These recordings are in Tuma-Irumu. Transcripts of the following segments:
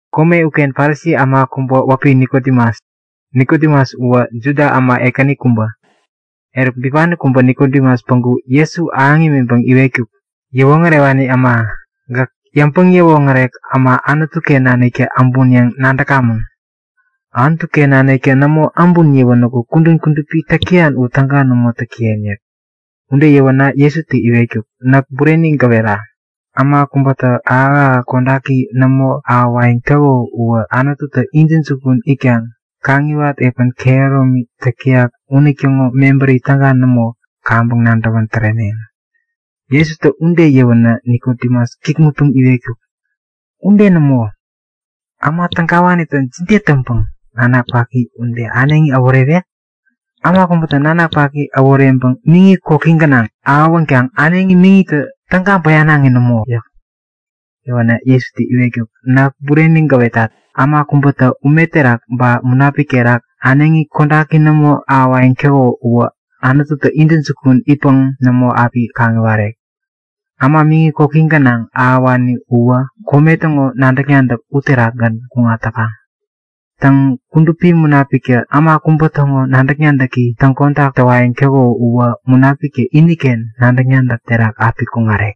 Kome uken Parisi äma kubä wäpi Nikodemus. Nikodemus uwä Juda äma ekäni kubä. Eruk bipani kubä Nikodemus päŋku Jesu ahäŋ imiŋpäŋ iwetkuk; Yäwoŋärewani äma, gäk yäŋpäŋ-yäwoŋärek äma Anutu-ken naniktä äbun yäŋ nadäkamäŋ. Anutu-ken naniktä nämo äbun yäwänäku kudän kudupi täk täyan u täga nämo täk täyen yäk. Ude yäwänä Jesutä iwetkuk; Näk bureni gäwera; Äma kubätä ahäk-ahäk kodaki nämo ahäwayäŋ täko uwä Anututä intäjukun itkaŋ yabäŋ yäwat epän kehäromi täk täyak unitäŋo mebärini täga nämo kaŋpäŋ nadäwän tärewek. Jesutä ude yäwänä Nikodemus kikŋutpäŋ iwetkuk; Ude nämo! Äma tägawanitä jide täŋpäŋ nanak paki ude äneŋi äworewek? Äma kubätä nanak paki äworeŋpäŋ miŋi koki gänaŋ ahäwänkaŋ äneŋi miŋitä täga bäyanaŋi nämo! yäk. Yäwänä Jesutä iwetkuk; Näk bureni gäwetat. Äma kubätä ume terak ba Munapik terak äneŋi kodaki nämo ahäwayäŋ täko uwä Anututä intäjukun itkaŋ nämo api kaŋiwarek. Äma miŋi koki gänaŋ ahäwani uwä kome täŋo nadäk-nadäk uterakgän kuŋat täkaŋ. Täŋ, Kudupi Munapiktä äma kubä täŋo nadäk-nadäki täŋkodak täwayäŋ täko uwä Munapiktä iniken nadäk-nadäk terak api kuŋarek.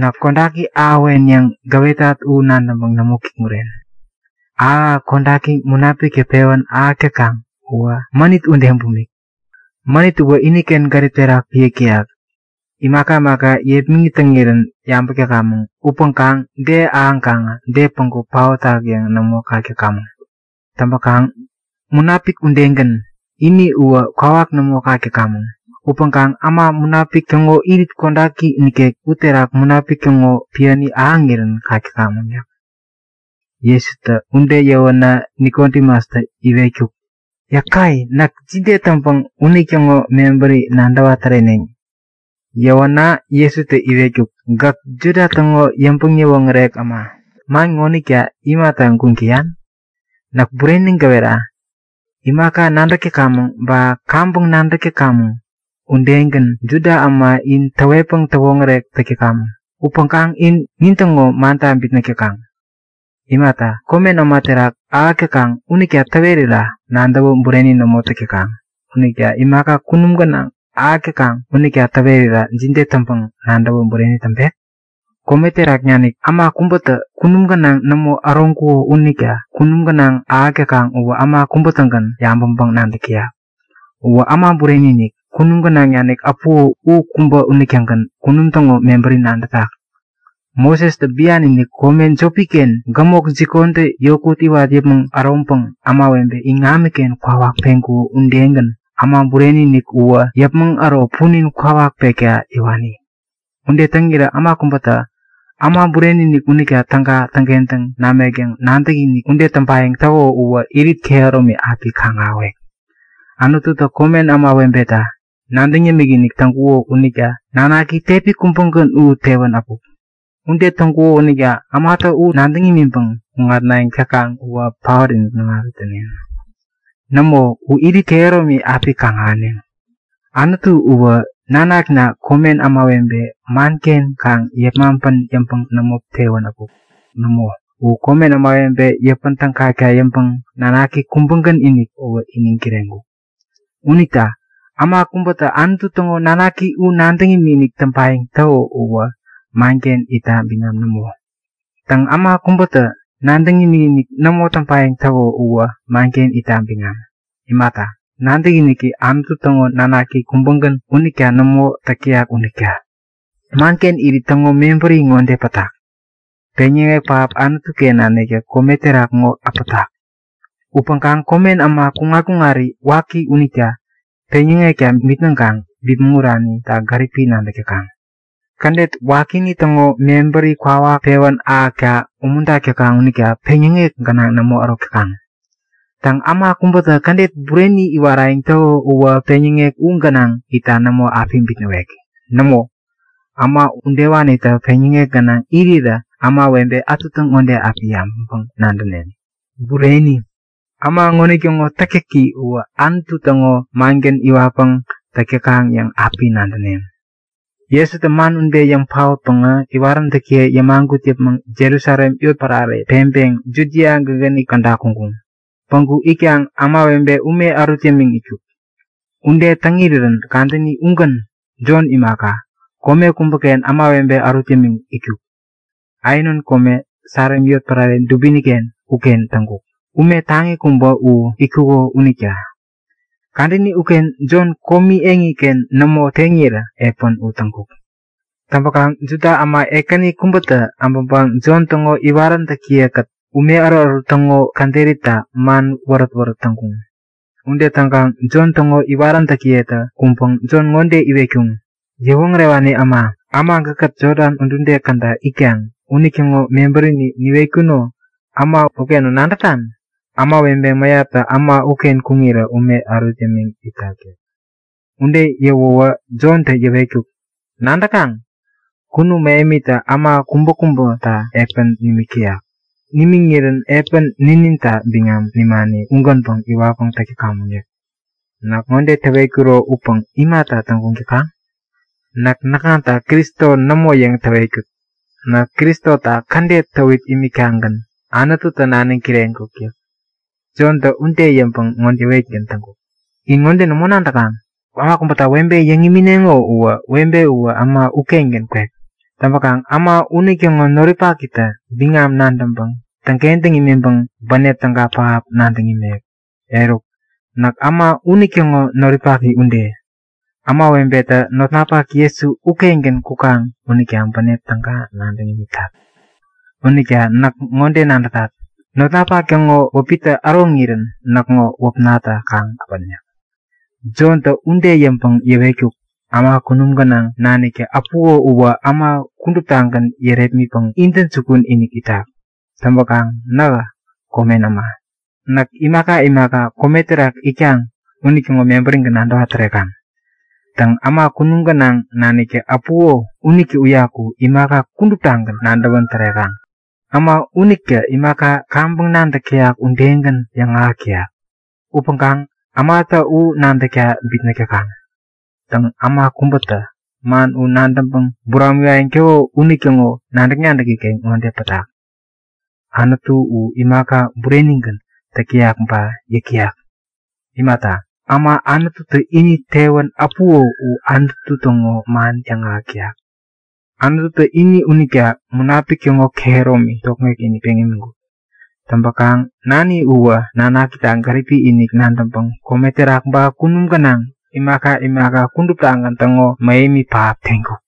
Näk kodaki ahäwen yäŋ gäwetat u nadäŋpäŋ nämo kikŋuren. Ahäkahäk kodaki Munapiktä pewän ahäk täkaŋ uwä mänit ude bumik. Mänit uwä iniken gärip terak piäk täyak. Imaka imaka yepmäŋit täŋirän yabäk täkamäŋ, upäŋkaŋ de ahäŋkaŋä de päŋku paotak yäŋ nämo kak täkamäŋ. Täŋpäkaŋ Munapik udegän, ini uwä kwawak nämo kak täkamäŋ. Upäŋkaŋ äma Munapik täŋo irit kodaki nikek uterak Munapik täŋo piäni ahäŋirän kak täkamäŋ yäk. Jesutä ude yäwänä Nikodemustä iwetkuk; Yäkai! Näk jide täŋpäŋ unitäŋo mebäri nadäwa täreneŋ? Yäwänä Jesutä iwetkuk; Gäk Juda täŋo yäŋpäŋ-yäwoŋärek äma ŋonitä man ŋonita imata täŋguŋ täyan? Näk bureni gäwera; Imaka nadäk täkamäŋ ba kaŋpäŋ nadäk täk täkamäŋ udegän Juda äma in täwetpäŋ täwoŋärek täk täkamäŋ. Upäŋkaŋ in nintäŋo manta bitnäk täkaŋ. Imaka komen äma terak ahäk täkaŋ unita täwerira nadäwä bureni nämo täk täkaŋ unita imaka kunum gänaŋ ahäk täkaŋ unita täwerawä jide täŋpäŋ nadäwä bureni täŋpek? Kome terak nanik äma kubätä kunum gänaŋ nämo äroŋkuko unita kunum gänaŋ ahäk täkaŋ uwä äma kubä-tägän yabäŋpäŋ-nadäk täyak. Uwä Äma Bureni-inik, kunum gänaŋ nanik äpuko u kubä unitägän kunum täŋo mebäri nadätak. Mosestä bian-inik kome jopi-ken gämok jikontä yokut iwat yäpmäŋ äroŋpäŋ ämawebe iŋamiken kwawak peŋkuko udegän Äma Bureni-inik uwä yäpmäŋ äro punin kwawak pekta yäwani. Ude täŋirä äma kubätä Äma Bureni-inik unitä täga täŋkentäŋ namek yäŋ nadäkinik ude täŋpayäŋ täko uwä irit kehäromi api kaŋ-ahäwek. Anututä komen ämawebeta nadäŋ yämik-inikinik täŋkuko unita nanaki tepi kubägän u tewän äpuk. Ude täŋkuko unita ämatä u nadäŋ imiŋpäŋ kuŋatnayäŋ täkaŋ uwä paot-inik nämo api täneŋ. Nämo, u irit kehäromi api kaŋ-ahäneŋ. Anutu uwä Nanakna komen ämawebe manken kaŋ yepmaŋpän yäŋpäŋ nämo tewän äpuk. Nämo, u komen ämawebe yäpän tägakta yäŋpäŋ nanaki kubägän-inik uwä iniŋ kireŋkuk. Unita äma kubätä Anutu täŋo nanaki u nadäŋ imikinik täŋpayäŋ täko uwä manken itta biŋam nämo. Täŋ, äma kubätä nadäŋ imikinik nämo täŋpayäŋ täko uwä manken itta biŋam. Imata, nadäkiniki Anutu täŋo Nanaki kubägän unita nämo täk täyak unita. Manken irit täŋo mebäri ŋode pätak; Peŋyäŋek pähap Anutu-ken naniktä kome terak ŋo äpätak. Upäŋkaŋ komen äma kuŋat-kuŋari waki unita peŋyäŋekta bitnäŋkaŋ bipmäŋ uranita gäripi nadäk täkaŋ. Kädet wakini täŋo mebäri kwawak pewä ahäkta umuntak täkaŋ unita peŋyäŋek gänaŋ nämo ärok täkaŋ. Täŋ, äma kubätä kädet bureni iwarayäŋ täko uwä peŋyäŋek u gänaŋ itta nämo api bitnäwek. Nämo, äma udewanitä peŋyäŋek gänaŋ irirä ämawebe ätutä ŋode api yabäŋpäŋ-nadäneŋ; Bureni! Äma unitäŋo täktäki uwä Anutu täŋo mangän iwatpäŋ täk täkaŋ yäŋ api nadäneŋ. Jesutä man ude yäŋ paotpäŋä iwaräntäkiye yämagut yäpmäŋ Jerusalem yotpärare peŋpeŋ Judia gägäni käda kuŋkuŋ. Päŋku itkaŋ ämawebe ume ärut yämiŋ itkuk. Ude täŋ irirän kadäni ugän Jon imaka, kome kubäken ämawebe ärut yämiŋ itkuk. Aenon kome, Salim yotpärare dubini-ken uken täŋkuk, ume taŋi kubä u itkuko unita. (Kadäni uken Jon komi eŋiken nämo teŋirä epän u täŋkuk.) Täŋpäkaŋ Juda äma ekäni kubätä äbäŋpäŋ Jon täŋo iwaräntäkiye-kät Anutu iŋamiken kuräki itta ume ärutärut täŋo käderita man wärät-wärät täŋkuŋ. Ude täŋkaŋ Jon täŋo iwaräntäkiyetä kuŋpäŋ Jon ŋode iwetkuŋ; Yäwoŋärewani äma, äma gäkkät Jodan udude käda itkaŋ unitäŋo mebärini niwetkuno äma ukeŋo nadätan? Ämawebe mäyaptä äma uken kuŋirä ume ärut yämiŋ itak yäk. Ude yäwäwä Jontä yäwetkuk; Nadäkaŋ? Kunum mähemitä äma kubäkubäta epän nimik täyak. Nimiŋirän epän nininta biŋam nimani ugänpäŋ iwatpäŋ täk täkamäŋ yäk. Näk ŋode täwetkuro upäŋ imata täŋguŋ täkaŋ? Näk näkŋata Kristo nämo yäŋ täwetkut. Näk Kristota kädet täwit imiktagän Anututä naniŋ kireŋkuk yäk. Jontä ude yäŋpäŋ ŋode yäwetgän täŋkuk; In ŋode nämo nadäkaŋ? Äma kubäta webe yäŋ imineŋo uwä webe uwä äma ukengän kwek. Täŋpäkaŋ äma unitäŋo noripakitä biŋam nadäŋpäŋ täŋkentäŋ imiŋpäŋ bänep täga pähap nadäŋ imek. Eruk, näk äma unitäŋo noripaki ude. Ämawebetä notnapak Jesu ukengän kukaŋ unita bänep täga nadäŋ imitat. Unita näk ŋode nadätat; Notnapak täŋo wäpitä äroŋirän näkŋo wäpnatä kaŋ äpän yäk. Jontä ude yäŋpäŋ yäwetkuk; Äma kunum gänaŋ naniktä äpuko uwä äma kuduptagän yärepmitpäŋ intäjukun-inik itak. Täŋpäkaŋ nähä komen äma. Näk imaka imaka kome terak itkaŋ unitäŋo mebärigän nadäwa tärekaŋ. Täŋ, äma kunum gänaŋ naniktä äpuko unitä uyaku imaka kuduptagän nadäwän tärekaŋ. Äma unitä imaka kaŋpäŋ nadäk täyak udegän yäŋahäk täyak. Upäŋkaŋ ämatä u nadäkta bitnäk täkaŋ. Täŋ, äma kubätä man u nadäŋpäŋ buramiwayäŋ täko unitäŋo nadäk-nadäki-ken ŋode pätak; Anutu u imaka burenigän täk täyak ba yäk täyak. Imata, äma Anututä ini tewän äpuko u Anutu täŋo man yäŋahäk täyak. Anututä ini unita Munapik täŋo kehäromi tokŋek-inik peŋ imiŋkuk. Täŋpäkaŋ Nani uwä Nanakita gäripi-inik nadäŋpäŋ kome terak ba kunum gänaŋ imaka imaka kuduptagän täŋo mähemi pähap teŋkuk.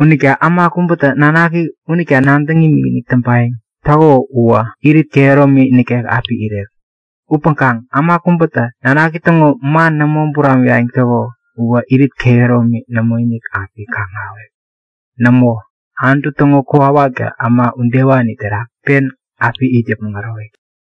Unita äma kubätä Nanaki unita nadäŋ imikinik täŋpayäŋ täko uwä irit kehäromi nikek api irek. Upäŋkaŋ äma kubätä Nanaki täŋo man nämo buramiwayäŋ täko uwä irit kehäromi nämoinik api kaŋ-ahäwek. Nämo, Anutu täŋo kokwawaktä äma udewani terak pen api it yäpmäŋ ärowek yäk.